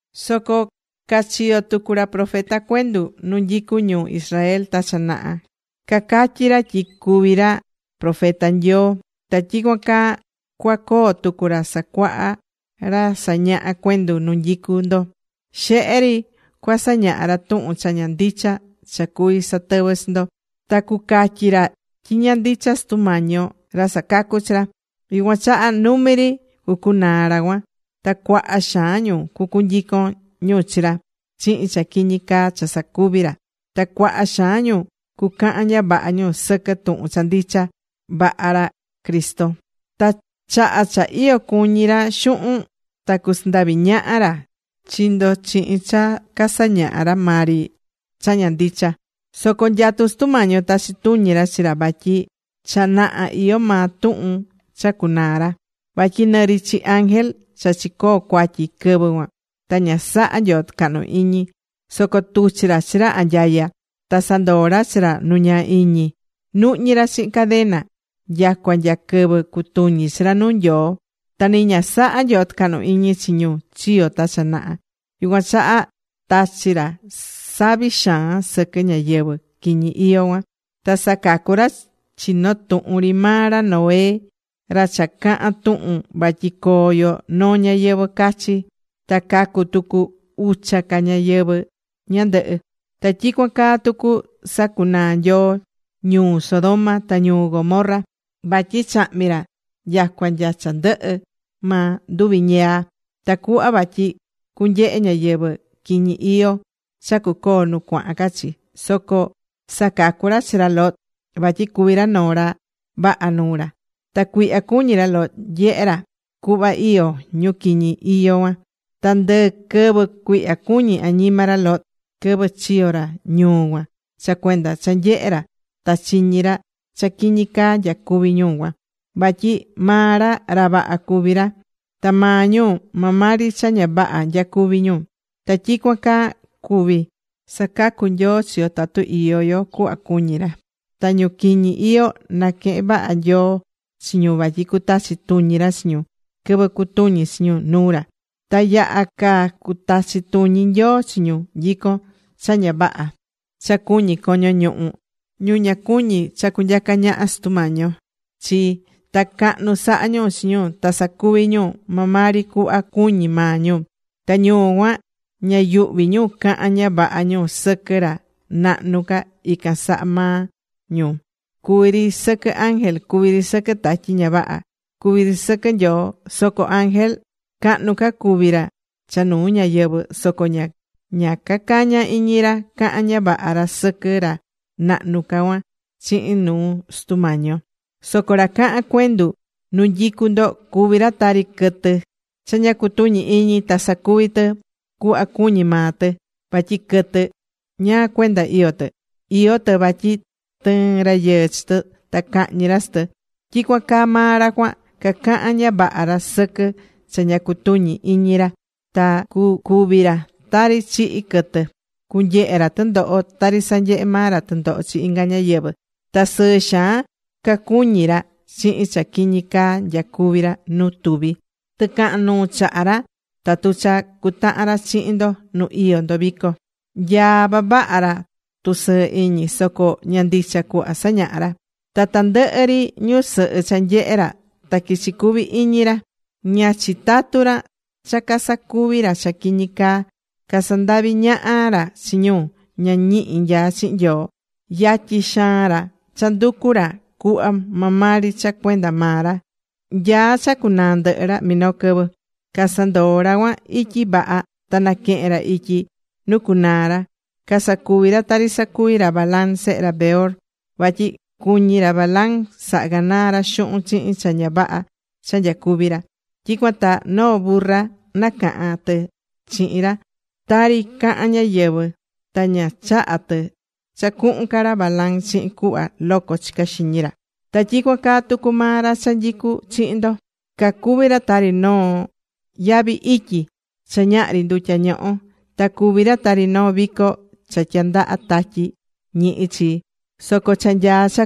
Soco cachiyo̱ tucu ra profeta cuendu nu nyicu ñu Israel ta cha naha, cacatyí ra tyi cuvi ra profeta Nyoo. Ta tyicuan caa cuacoo tucu ra sacuahá ra sañahá cuendu nu nyicu ndo. Xehe ri cuasañaha ra tuhun cha ña ndicha cha cuví satɨvɨ chi ndo. Ta cuacatyi ra tyi ña ndicha Sutu Mañi yo ra sacacu̱ chi ra. Yucuan chaha numi ri cucunaa ra cuan. Ta cuaha xaan ñu cucunyicon ñu chi ra chihin cha quiñi caa cha sacuví ra. Ta cuaha xaan ñu cucahan ña vaha ñu sɨquɨ tuhun cha ndicha vaha ra Cristo. Ta chaha cha iyo cuñi ra xuhun, ta cusandavi ñaha ra chi ndo chihin cha casañahá ra maa ri cha ña ndicha. Soco nyatú Sutu Mañi yo tachi tuñi ra chi ra vatyi cha naha iyó maa tuhun cha cunaa ra. Vatyi nɨ ri chi ángel cha chicoo̱ cuatyi quɨvɨ cuan ta ña saha̱ Nyoo tɨcahnu iñi. Soco tuchi̱ ra chi ra anyaya. Ta sandoo̱ ra chi ra nu ñaa iñi, nuhñí ra chihin cadena nyacua nya quɨvɨ cutuñi chi ra nuu Nyoo. Ta ni ña saha̱ Nyoo tɨcahnu iñi chi ñu chiyo̱ ta cha naha. Yucuan chaha tachi̱ ra savi xaan sɨquɨ ñáyɨvɨ quiñi iyó cuan. Ta sacacu̱ ra chi noo tuhun ri maa ra Noé, ra cha cahan tuhun vatyi coo yo noo ñayɨvɨ̱ cachi. Ta cacu̱ tucu ucha ca ñáyɨvɨ ñandɨhɨ. Ta tyicuan caa tucu sacunaa̱ Nyoo ñuu Sodoma ta ñuu Gomorra. Vatyi chahmi̱ ra nyacua nya cha ndɨhɨ maa nduvi̱ ñiyaa. Tacuhva vatyi cunyehe ñáyɨvɨ quiñi iyó cha cucoo nu cuahan ca chi. Soco sacacu̱ ra chi ra Lot vatyi cuví ra noo ra vaha nuu ra. Ta cuihya cuñí ra Lot nyehé ra cuhva iyó ñu quiñi iyó cuan. Ta ndɨ quɨvɨ cuihya cuñí añima ra Lot quɨvɨ chiyo ra ñuu cuan, cha cuenda cha nyehe̱ ra ta chiñi̱ ra cha quiñi caa nyacuvi̱ ñu cuan. Vatyi maa ra, ra vaha cuví ra. Ta maa ñu maa maa ri cha ña vaha nyacuví ñu. Ta tyicuan caa cuví sacacu Nyoo chi yo tatu iyó yo cuhva cuñí ra. Ta ñu quiñi iyó naquehén vaha Nyoo chi ñu vatyi cutachi tuñi ra chi ñu quɨvɨ cutuñi chi ñu nuu ra. Ta yaha ca cutachi tuñi Nyoo chi ñu nyicón cha ña vaha cha cuñí coño ñuhu, ñu ña cuñí cha cunyaca ñaha Sutu Mañi yo chi. Ta cahnu sahá ñu chi ñu ta sacuví ñu maa ri cuhva cuñí maa ñu. Ta ñu cuan ña yuhví ñu cahan ña vaha ñu sɨquɨ ra nahnu ca ican saha maa ñu cuví ri sɨquɨ ángel, cuví ri sɨquɨ tatyi ña vaha, cuví ri sɨquɨ Nyoo. Soco ángel, cahnu ca cuví ra cha nuu ñáyɨvɨ, soco ña cacañá iñi ra cahan ña vaha ra sɨquɨ ra nahnu ca cuan chihin nuu Sutu Mañi yo. Soco ra cahán cuendu nu nyicú ndo cuví ra tari quɨtɨ cha ña cutuñí iñi ta sacuví tɨ cuhva cuñí maa tɨ. Vatyi quɨtɨ, ¿ñáá cuenda iyó tɨ? Iyó tɨ vatyi tɨɨn rayɨɨ chi tɨ, ta cahñi ra chi tɨ. Tyicuan caa maa ra cuan. Cacahán ña vaha ra sɨquɨ cha ña cutuñí iñi ra. Ta cucúvi ra tari chihí quɨtɨ. Cunyehe ra tɨndoho tari sanyehé maa ra tɨndoho chi inga ñáyɨvɨ. Ta sɨɨ xaan cacuñí ra chihin cha quiñi caá nyacuví ra nu tuvi. Tɨcahan nuu chahá ra, tatu cha cutahan ra chihin ndo nu iyó ndo vico. Nyaá vavaha ra tusɨɨ iñi. Soco ña ndicha cuhva sañahá ra. Ta tandɨhɨ ri ñusɨhɨ cha nyehe ra ta quichi cuvi iñi ra. Ña chitatú ra cha casacuvi ra cha quiñi caa. Casandaví ñaha ra chi ñu ña ñihi nyaá chihin Nyoo. Yatyi xaan ra cha nducu ra cuhva maa maa ri cha cuenda maa ra. Nyaá cha cunaa ndɨhɨ ra minoo quɨvɨ. Casandoo̱ ra cuan ityi vaha ta naquehe̱n ra ityi nu cucunaa ra. Casacuví ra tari sacuvi̱ ra Balaam sehe ra Beor. Vatyi cuñí ra Balaam saha ganaa ra xuhun chihin cha ña vaha cha nyacuví ra. Tyicuan ta noo burra nacaha̱n tɨ chihin ra, tari cahán ñáyɨvɨ, ta ña chaha̱ tɨ cha cuhun ca ra Balaam chihin cuhva loco chicá xiñi ra. Ta tyicuan caa tucu maa ra cha nyicú chihin ndo. Cacuví ra tari noo yavi ityi cha ñahri ndutya ñohó. Ta cuví ra tari noo vico cha tyandaha tatyi ñihi chi. Soco cha nyaá cha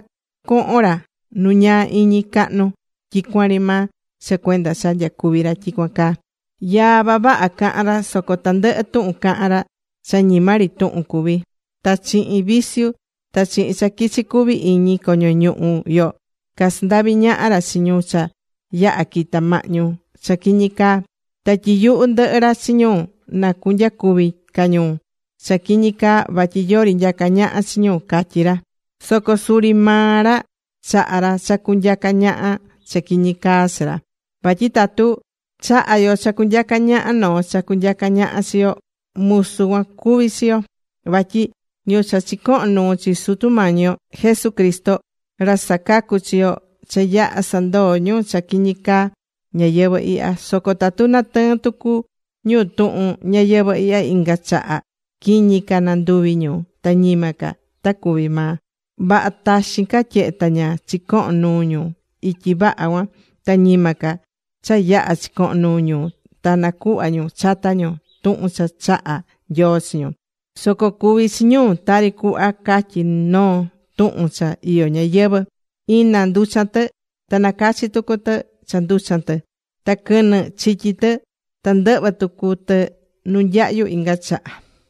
cohon ra nu ñaa iñi cahnu tyicuan ri maa cha cuenda cha nyacuví ra tyicuan caa. Yaa vavaha cahán ra soco tandɨhɨ tuhun cahán ra cha ñima ri tuhun cuví. Ta chihin vicio ta chihin cha quichi cuvi iñi coño ñuhu yo casandaví ñaha ra chi ñu cha yaha̱ quita̱ mahñu cha quiñi caa. Ta tyiyuhú ndɨhɨ ra chi ñu na cunyacuvi ca ñu cha quiñi caa vatyi yori nyacá ñaha chi ñu, catyí ra. Soco suri maa ra chahá ra cha cunyaca ñaha cha quiñi caa chi ra. Vatyi tatu chahá yo cha cunyaca ñaha noo cha cunyaca ñaha chi yo, musu cuan cuví chi yo. Vatyi ñu cha chicoho̱n nuu chi Sutu Mañi yo Jesucristo, ra sacacú chi yo, cha yaha̱ sandoo̱ ñu cha quiñí caa ñayɨvɨ̱ ihya. Soco tatu natɨɨn tucu ñu tuhun ñayɨvɨ̱ ihya inga chaha, quiñi ca nanduvi ñu ta ñima ca ta cuvi maa. Vaha taxin ca tyehe ta ña chicoho̱n nuu ñu ityi vaha cuan, ta ñima ca cha yaha̱ chicoho̱n nuu ñu ta nacuhva ñu chata ñu tuhun cha chaha̱ Nyoo chi ñu. Soco cuvi̱ chi ñu tari cuhva catyí noo tuhun cha iyó ñayɨvɨ̱: “Ina nducha̱n tɨ, ta nacachi̱ tucu tɨ cha nducha̱n tɨ. Ta quɨnɨ chityi̱ tɨ, ta ndɨhvɨ̱ tucu tɨ nu nyahyu inga chaha.”